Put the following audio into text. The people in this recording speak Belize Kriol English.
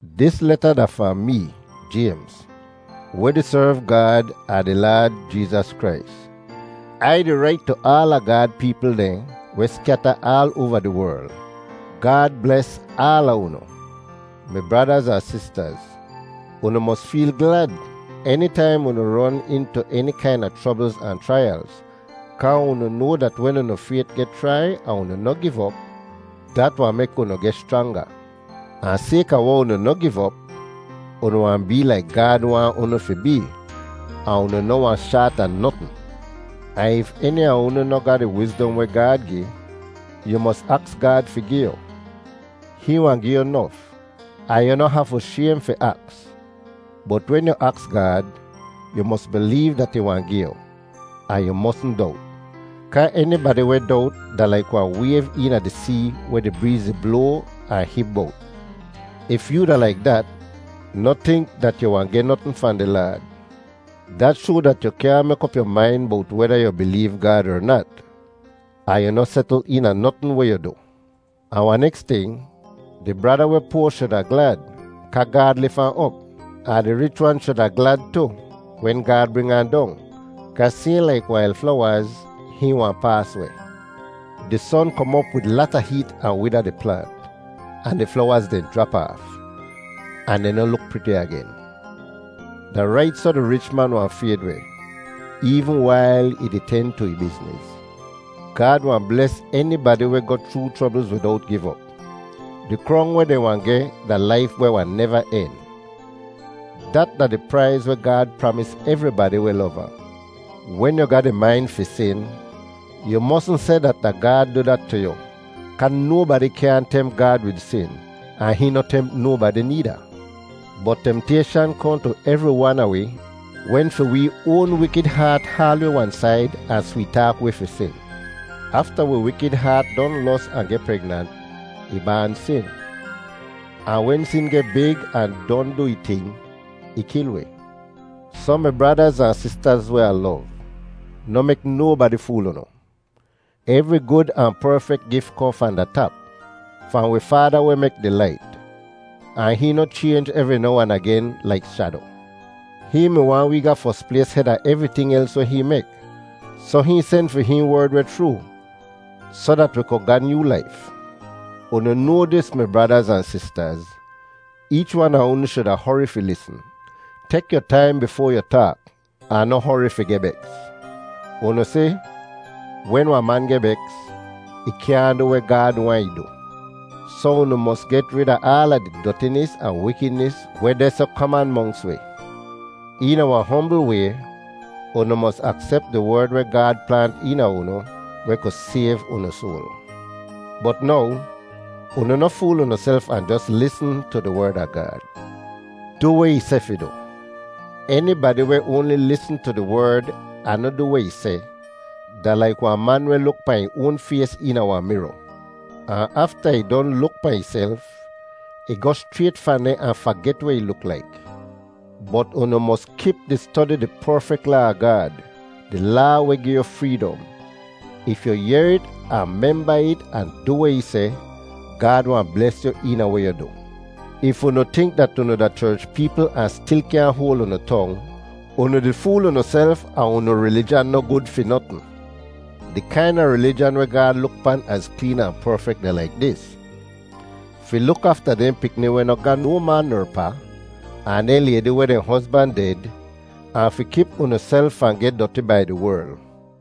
Dis leta da fahn mee, Jaymz, weh di serv Gaad ahn di Laad Jeezas Krais. Ai di rait tu aala Gaad peepl dehn weh skyata aal oava di werl. Gaad bles aala unu. Mi bradaz ahn sistaz, unu mos feel glad enitaim unu ron intu eni kaina chroblz ahn chraiyalz, kaa unu noa dat wen unu fayt geh chrai ahn unu noh giv op, dat wahn mek unu geh schranga. Ahn sayka weh unu noh giv op, unu wahn bee laik Gaad waahn unu fi bee, ahn unu noh wahn shaat a notn. Ahn if eni a unu noh ga di wizdom weh Gaad gi, yu mos aks Gaad fi gi yu. Hihn wahn gi yu nof, ahn yu noh hafu shaym fi aks. Bot wen yu aks Gaad, yu mos bileev dat ih wahn gi yu, ahn yu mosn dowt. Kaa enibadi weh dowt da laik wahn wayv eena di see weh di breez di bloa ahn hib bowt. If yoo da laik dat, noh tink dat yu wahn geh notn fahn di Laad. Dat shoa dat yu kyaahn mek op yu main bowt weda yu bileev Gaad er nat, ahn yu noh setl eena notn weh yu du. Ahn wahn neks ting, di brada weh poa shuda glad kaa Gaad lif ahn op. Ahn di rich wan shuda glad tu wen Gaad bring ahn dong kaa sayhn laik wail flowaz, hihn wahn paas weh. Di son kom op wid lata heet ahn wida di plaant, ahn di flowaz dehn jrap aaf, ahn dehn noh luk priti agen. Da rait soh di rich man wahn fayd weh, eevn wail ih di ten tu ih bizniz. Gaad wahn bles enibadi weh goh chroo chroblz widowt giv op. Di krong weh dehn wahn geh da laif weh wahn neva en. Dat da di praiz weh Gaad pramis evribadi weh lov ahn. Wen yu ga di main fi sin, yu mosn seh dat da Gaad du dat tu yu, kaa nobadi kyaahn temp Gaad wid sin, ahn hihn noh temp nobadi needa. Bot temtayshan kohn tu evri wan a wi wen fi wee oan wikid haat haal wi wan said ahn sweet-taak wi fi sin. Afta wi wikid haat don los ahn geh pregnant, ih baan sin. Ahn wen sin geh big ahn don du ih ting, ih kil wi. Soh mi bradaz ahn sistaz weh Ah lov, noh mek nobadi fool unu. Evri gud ahn perfek gif kohn fahn da tap, fahn wi Faada weh mek di lait. Ahn hihn noh chaynj evri now ahn agen laik shado. Hihn mi waahn wee ga fos plays heda evriting els weh hihn mek, soh hihn sen fi hihn Werd weh chroo, soh dat wi ku ga nyoo laif. Unu noa dis mi bradaz ahn sistaz: Eech wan a unu shuda hori fi lisn. Tek yu taim bifoa yu taak, ahn noh hori fi geh beks. Unu si, wen wahn man geh beks, ih kyaahn du weh Gaad waahn ih du. Soh unu mos get rid a aala di dotinis ahn wikidnis weh deh soh kaman monks wi. Eena wahn hombl way, unu mos aksep di Werd weh Gaad plaant eena unu weh ku sayv unu soal. Bot now, unu noh fool unuself ahn jos lisn tu di Werd a Gaad. Du weh ih seh fi du! Enibadi weh oanli lisn tu di Werd ahn noh du weh ih seh da laik wahn man weh luk pahn ih oan fays eena wahn miro, ahn afta ih don luk pahn ihself, ih goh schrayt fahn deh ahn faget weh ih luk laik. Bot unu mos kip di stodi di perfek Laa a Gaad, di Laa weh gi yu freedom. If yu yehr it ahn memba it ahn du weh ih seh, Gaad wahn bles yu eena weh yu du. If unu tink dat unu da cherch peepl ahn stil kyaahn hoal unu tong, unu di fool unuself ahn unu rilijan noh gud fi notn. Di kaina rilijan weh Gaad luk pan az kleen ahn perfek da laik dis: fi luk afta dehn pikni weh noh ga no ma ner pa, ahn dehn laydi weh dehn hozban ded, ahn fi kip unuself fahn geh doti bai di werl.